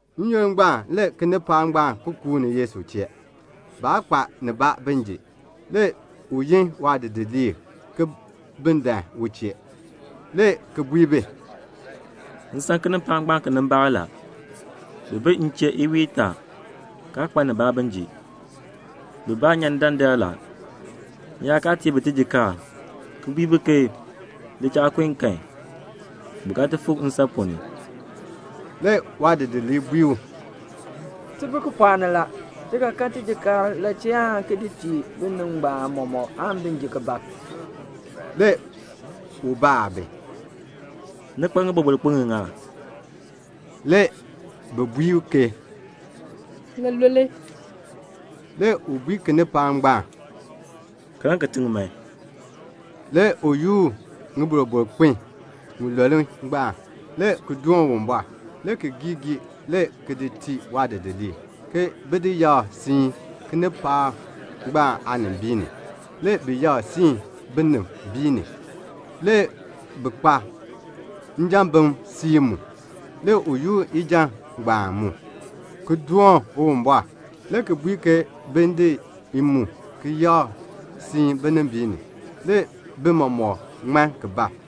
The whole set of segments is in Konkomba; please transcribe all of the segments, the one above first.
N-yoonn ngbaan le kinipaak ngbaan ki kuuni Yesu chee. Baa kpa nibaa bin ji. Le u yin waadidiliib ke bin dan u chee, le ki bui bi, "M san kinipaak ngbaan kinimbaak la; bi bi m chee iwiin itaa, kaa kpa nibaa bin ji. Bibaa nyan ni dandar la. M yaa kaa tii bi tijikaar, ki bui bi ke bi li cha kun kan, bi ga ti fik nsan ponn ni." Le waadidiliib bui u, "Ti bi kipɔɔk ni la. Ti ga kan tijiir la chee aan ki di tii binib ngbaan mɔmɔk aan bi ji bab?" Le u baa bi, "Ni kpa ŋiboroboro kpin ŋiŋa?" Le bi bui ke, "Ŋilule." Le u bui kinipaak ngbaan, "Kaln kitiŋ man." Le u yoor ŋiboroboro kpin ŋilule ngbaan, le ki doon Uwumbɔr, le ki gii gii, le ki di tii waadidiliib, bin ti yakr siin kinipaak ngbaan aanimbiin ni. Le bi yakr ki siin binimbiin ni. Le bi kpa njambim siib mu. Le u yoor ijan ngbaan mu, ki doon Uwumbɔr, le ki bui bi ke bin di i mu ki di yakr siin binimbiin ni. Le bi mɔmɔk ŋman ki bab.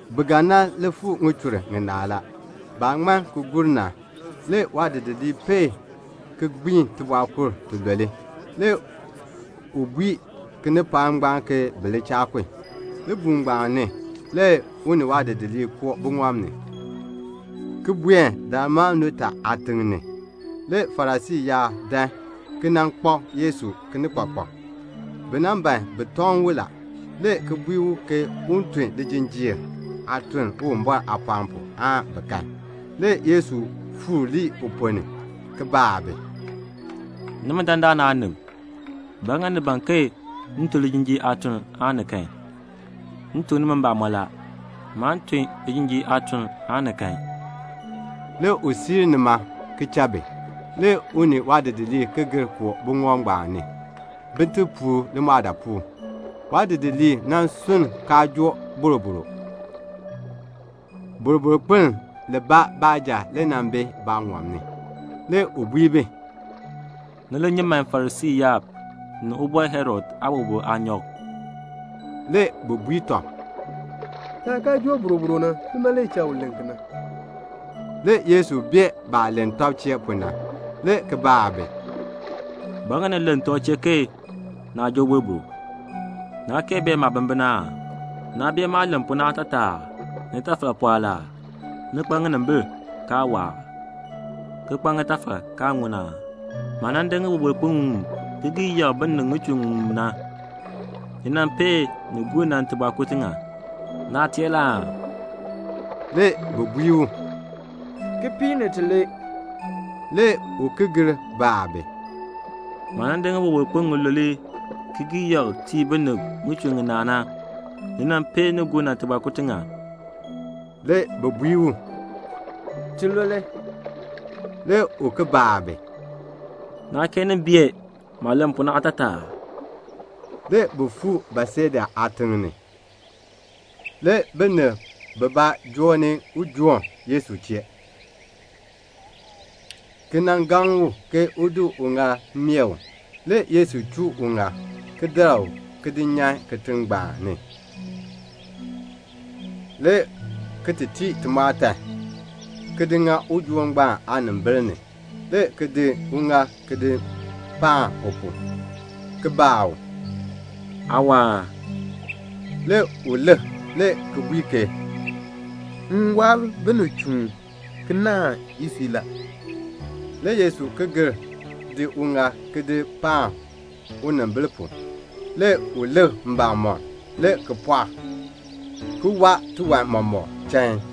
Bi ga nan li fuu ŋichur ŋinaa la. Baah ŋman ki gur na, le waadidiliib peei ki gbiin tibɔɔkur tilule. Le u bui kinipaak ngbaan ke bi li cha kun. Libuul ngbaan ni, le u ni waadidiliib koo buŋɔb ni, ki buen Dalmanuta aatiŋ ni. Le Farisii yaab dan, ki nan kpak Yesu kinikpakpak. Bi ban bi tɔŋ u la, le ki bui u ke un tun lijinjiir aatuln Uwumbɔr aapɔɔn pu, bin kan. Le Yesu fuur lii uponn ni, le ki baa bi, "Nimi dandana aanib, ba ŋa ni ban ke m tun lijinjiir aatuln aan ni kan? M tuk nimi mbamɔn la, maan tun lijinjiir aatuln aan ni kan." Le u siir nima ki cha bi. Le u ni waadidiliib ki gir koo buŋɔb ngbaan ni, bin ti puur limɔɔdaapuul. Le waadidiliib sunn kaa joo boroboro. Boroboro kpiln libaa baanja le bi baaŋɔb ni. Le u bui bi, "Ni li nyi man Farisii yaab ni Ubɔr Herod aaboroboro aanyɔk." Le bi bui tɔb, "Taah kaa joo boroboro na, nima le cha u len kena." Le Yesu bee baah len tɔb chee pu na, le ki baa bi, "Ba ŋa ni len tɔb chee ke naa joo boroboro? Naa kee bee maabimbin aa? Naa bee maah len pu na aatataa aa? Nitafal pɔɔ la aa? Ni kpa ŋinimbil, kaa waa aa? ki kpa ŋitafal, kaa ŋun aa? Maah nan di ŋiboroboro kpin ŋiŋmu ki gii yakr binib ŋichur ŋiŋmu na, ni peei nin gur na tibɔɔkur tiŋa? Naa teer la aa?" Le bi bui u, "Kipiik ni tilee." Le u ki gir baa bi, "Maah nan di ŋiboroboro kpin ŋilule ki gii yakr tii binib ŋichur ŋinaa na, ni pee nin gur na tibɔɔkur tiŋa?" Le bi bui u, "Tilule." Le u baa bi, "Naa kee nin bee maah len pu na aatataa aa?" Le bi fuu Betseda aatiŋ ni. Le binib bibaa joo ni ujoon Yesu chee, le ki gaŋ u ke u nan di uŋaal ki di meeh u. Le Yesu chuu uŋaal, le ki dar u ki di nyan kitiŋ ni, le ki tii timɔɔtan, ki di ŋa ujoon ngbaan aanimbil ni, le ki di uŋaal ki di paan u pu, le ki baa u, "Aa waa aa?" Le u lik, le ki bui ke, "M waa binib chuun, ki naahn isui la." Le Yesu ki gir di uŋaal ki di paan unimbil pu. Le u lik mbamɔm, le ki pɔɔk, le ki waa tiwan mɔmɔk chain.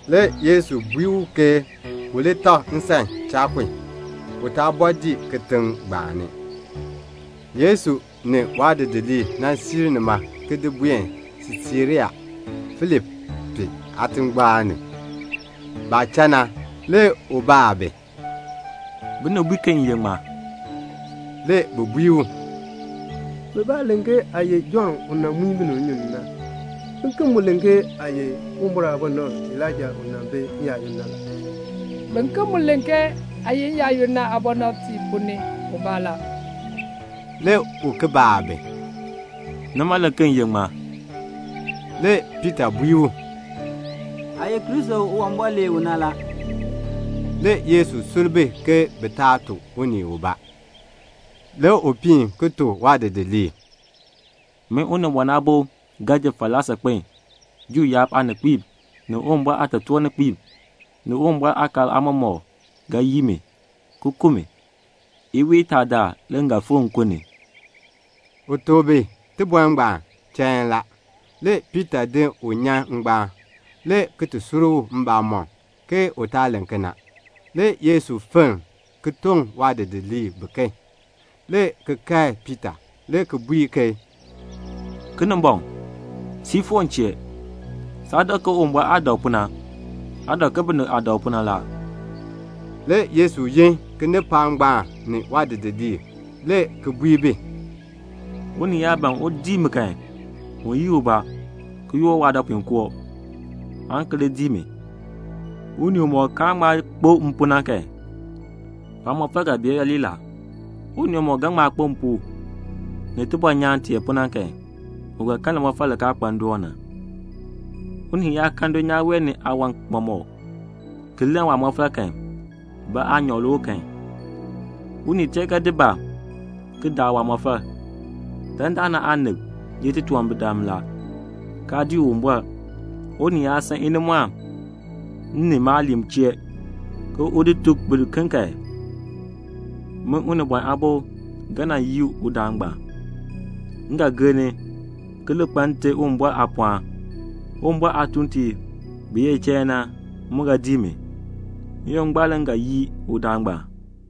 Le Yesu bui u ke u li tak nsan cha kun. U taa bɔɔ dii kitiŋ ngbaan ni. Le Yesu ni waadidiliib siir nima ki ti buen Siisarea Filipi aatingbaan ni. Baah cha na, le u baa bi, "Binib bui ke m ye ŋmaa?" Le bi bui u, "Bibaa len ke aa ye Jɔnn u nan muin binib nnyun ni na. Biken mu len ke aa ye Uwumbɔr aabɔnabr Elaija u nan bi n-yaayoonn na la. Biken mu len ke aa ye n-yaayoonn na aabɔnabtiib ponn ni ubaa la." Le u baa bi, "Nimi, ni len ke m ye ŋmaa?" Le Piita bui u, "Aa ye Kristo u Uwumbɔr lee u na la." Le Yesu sur bi ke bi taa tuk unii ubaa. Le u piin ki tuk waadidiliib, "Min Unibɔn Aabo ga ji falaa saakpen. Juu yaab aaninkpiib, ni Uwumbɔr aatotoorninkpiib, ni Uwumbɔr aakaal aamɔmɔkb ga yii mi, ki ku mi. Iwiin itaa daal le m ga fikr nkun ni." U tuk bi tibɔr ngbaan chain la. Le Piita di u ki di nyan ngbaan, le ki kae u, ke u taa len kena. Le Yesu fenn ki toŋ waadidiliib biken, le ki kae Piita, le ki bui ke, "Kinimbɔŋ, siir foor m chee. Saa dak ke Uwumbɔr aah dak pu na. Aa dak ke binib aah dak pu na la." Le Yesu yin kinipaak ngbaan ni waadidiliib, le ki bui bi, "Unii yaa ban un dii mi kan, un yii ubaa, ki yoor waadɔpuinkoo, aan ki li dii mi. Unii umɔk kaan ŋma kpo m pu na kan, waamɔfal ga bee yooli la. Unii umɔk ga ŋma kpo m pu, ni tibɔnyaan tee pu na kan, u ga kan limɔfal li kaa kpa ndoon na. Unii yaa kan dulnyaa wee ni aawan mɔmɔk, ki lann waamɔfal kan, ba aanyoor le u kan? Unii tee ga di ba ki daa waamɔfal? Dandana aanib ye titunwambirdam la, kaa dii Uwumbɔr. Unii yaa san inimɔɔn m ni maaliin chee, un tuk bi kan, min Unibɔn Aabo ga nan yii udaan ngbaan. M ga gir ni, ki li kpa Nte Uwumbɔr aapɔɔn. Uwumbɔr aatuuntiib bi ye chain na, mu ga dii mi. N-yoonn ngbaan le m ga yii udaan ngbaan."